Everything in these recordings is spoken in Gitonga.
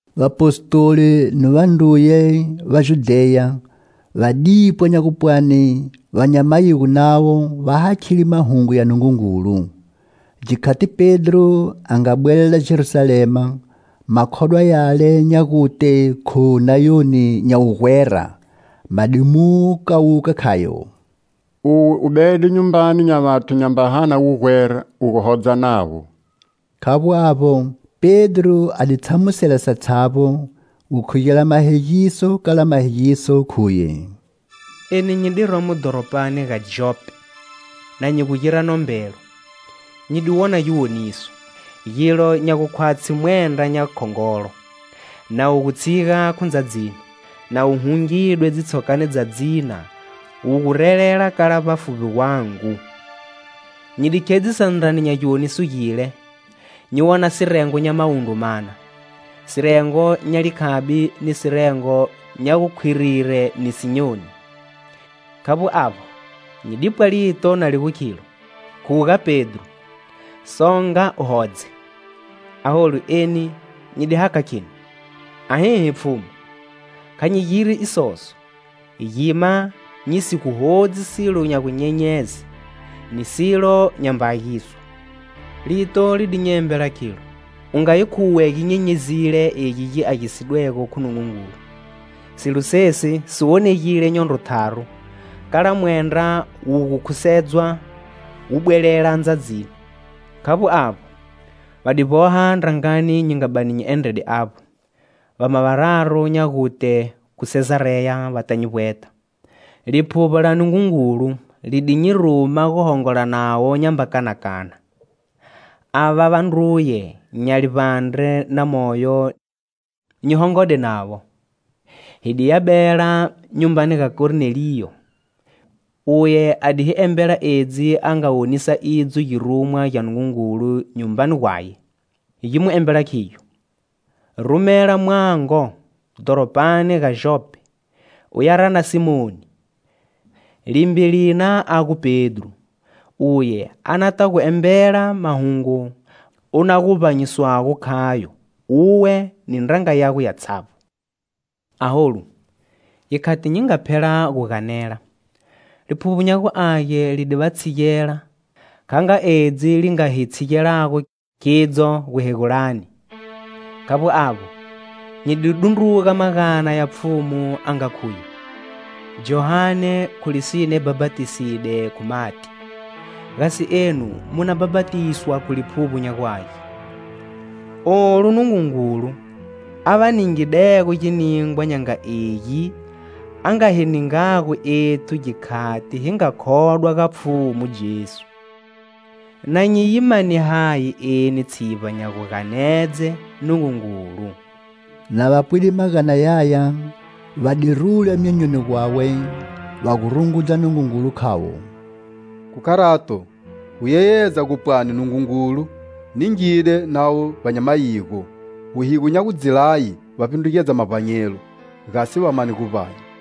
Vapostoli ni vandruye va Judheya va dipwa nya gupwani va nya mayigo navo va hakhile mahungu ya Nungungulu. Gikhati Pedro a nga bwelela Jerusalema, makhodwa yale nya gute khu nayoni nya wugwera ma di mu kawuka khayo: "Uwe u bede nyumbani nya vathu nyamba hana wugwera u gu hodza navo." Khavbo avbo, Pedro a di tshamusela satshavbo, gukhugela mahegiso kala mahegiso, khuye: "Eni nyi di romo dhoropani ga Jope na nyi gu gira nombelo, nyi di wona giwoniso: gilo nya gukhwatshi mwendra nya khongolo, na wu gu tshiga khu ndzadzini, na wu hungidwe dzitshokani dza dzina, wu gurelela kala vbafuvbi gwangu. Nyi di khedzisa ndrani nya giwoniso gile, nyi wona sirengo nya mawundru mana, sirengo nya likhabi ni sirengo nya gu khwirire ni sinyoni. Khavbo avbo, nyi dipwa lito na li gu khilo: 'Khuga, Pedro! Songa u hodze.' Aholu, eni nyi di hakha kheni: 'Ahihi, Pfhumu, kha nyi giri isoso; gima nyi si gu hodzi silo nya gunyenyeze ni silo nyamba agiswa.' Lito li di nyi embela khilo: 'U nga yi khuwe gi nyenyezile egi gi agisidwego khu Nungungulu.' Silo sesi si wonegile nyondro tharu kala mwendra wu gu khusedzwa wu bwelela ndzadzini. Khavbo avbo, va di vboha ndrangani nyi nga bani nyi endrede avbo, vama vararu nya gute khu Sezareya va ta nyi vbweta. Liphuvbo la Nungungulu li di nyi ruma guhongola navo nyamba kanakana. Ava vandruye nya livbandre na moyo nyi hongode navo, hi di ya bela nyumbani ga Korneliyo. Uye a di hi embela edzi a nga wonisa idzo girumwa gya Nungungulu nyumbani gwaye. Gi mu embela khigyo: 'Rumela mwango dhoropani ga Jope u ya rana Simoni, limbe lina a gu Pedro. Uye a na ta gu embela mahungu u na guvbanyiswago khayo uwe ni ndranga yago yatshavbo.' Aholu, gikhati nyi nga phela gu ganela, Liphuvbo nya gu Age li di va tshigela kha nga edzi li nga hi tshigelago khidzo guhegulani. Khavbo avbo, nyi di dundruga magana ya Pfhumu a nga khuye: 'Johane, khu lisine bhapatiside khu mati, gasi enu mu na bhapatiswa khu Liphuvbo nya gu Age.' Olu Nungungulu a va ningidego giningwa nya nga egi a nga hi ningago ethu gikhati hi nga khodwa ga Pfhumu Jesu, na nyi yi mane hayi eni tshivba nya guganedze Nungungulu?" Na va pwide magana yaya va di rula myonyoni gwawe va gu rungudza Nungungulu khavo: "Khu kharato, gu yeyedza gu pwani Nungungulu ningile navo va nya mayigo wuhigo nya gu dzi laye va vbindrugedza mavbanyelo, gasi va mane guvbanya."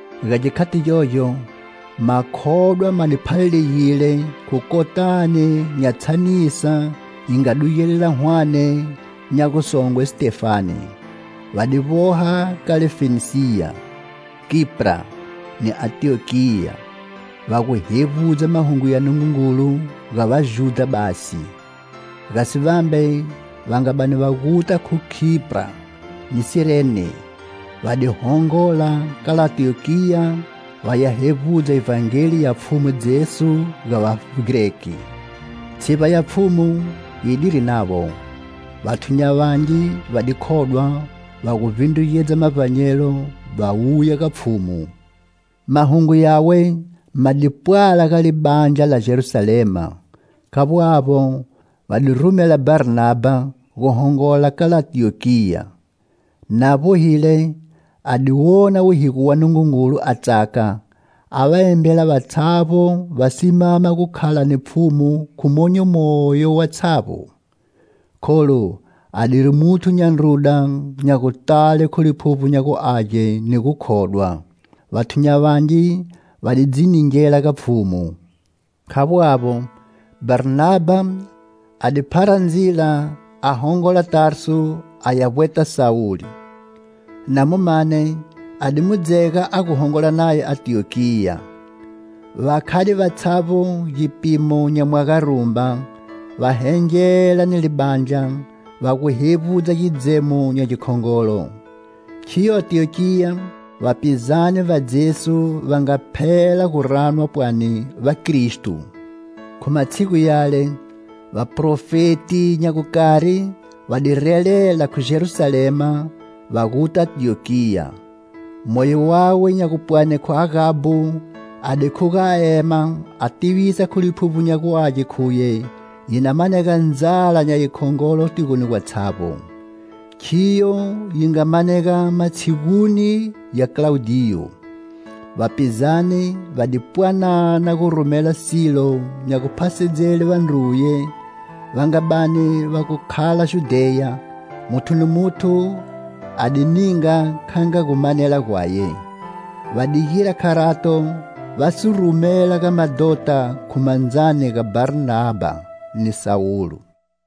Ga gikhati gyogyo, makhodwa ma di phalalegile khu kotani nya tshanisa yi nga dugelela hwane nya gusongwe Sitefane. Va di vboha kala Fenisiya, Kipra ni Antiyokiya, va gu hevbudza mahungu ya Nungungulu ga Vajudha basi. Gasi vambe, va nga bani va guta khu Kipra ni Sirene, va di hongola kala Antiyokiya va ya hevbudza Ivhangeli ya Pfhumu Jesu ga Vagreki. Tshivba ya Pfhumu yidiri navo. Vathu nya vangi va di khodwa, va gu vbindrugedza mavbanyelo, va wuya ga Pfhumu. Mahungu yawe ma di pwala ga libandla la Jerusalema. Khavbo avbo, va di rumela Bharnabha gu hongola kala Antiyokiya. Na vbohile, a di wona wuhigo wa Nungungulu a tsaka, a va embela vatshavbo va simama gu khala ni Pfhumu khu monyo moyo vatshavbo. Kholu a diri muthu nya ndruda nya gutale khu Liphuvbo nya gu Age ni gukhodwa; vathu nya vangi va di dzi ningela ga Pfhumu. Khavbo avbo, Bharnabha a di phara ndzila a hongola Tarsu a ya vbweta Sawulo; na mu mane, a di mu dzega a gu hongola naye Antiyokiya. Va khade vatshavbo gipimo nya mwaga rumba, va hengela ni libandla, va gu hevbudza gidzemo nya gikhongolo. Khiyo Antiyokiya vapizane va Jesu va nga phela guranwa pwani vakristo. Khu matshigu yale, Vaprofeti nya gukari va di relela khu Jerusalema va guta Antiyokiya. Moyo wawe nya gupwani khu Agabo a di khuga a ema a tivisa khu Liphuvbo nya gu Age khuye yi na manega ndzala nya yikhongolo tigoni gatshavbo; khiyo yi nga manega matshiguni ya Klaudiyo. Vapizane va di pwanana gu rumela silo nya guphasedzele vandruye va nga bani va gu khala Judheya, muthu ni muthu a di ninga kha nga gu manela gwaye. Va di gira kharato va si rumela ga madhota khu mandzani ga Bharnabha ni Sawulo.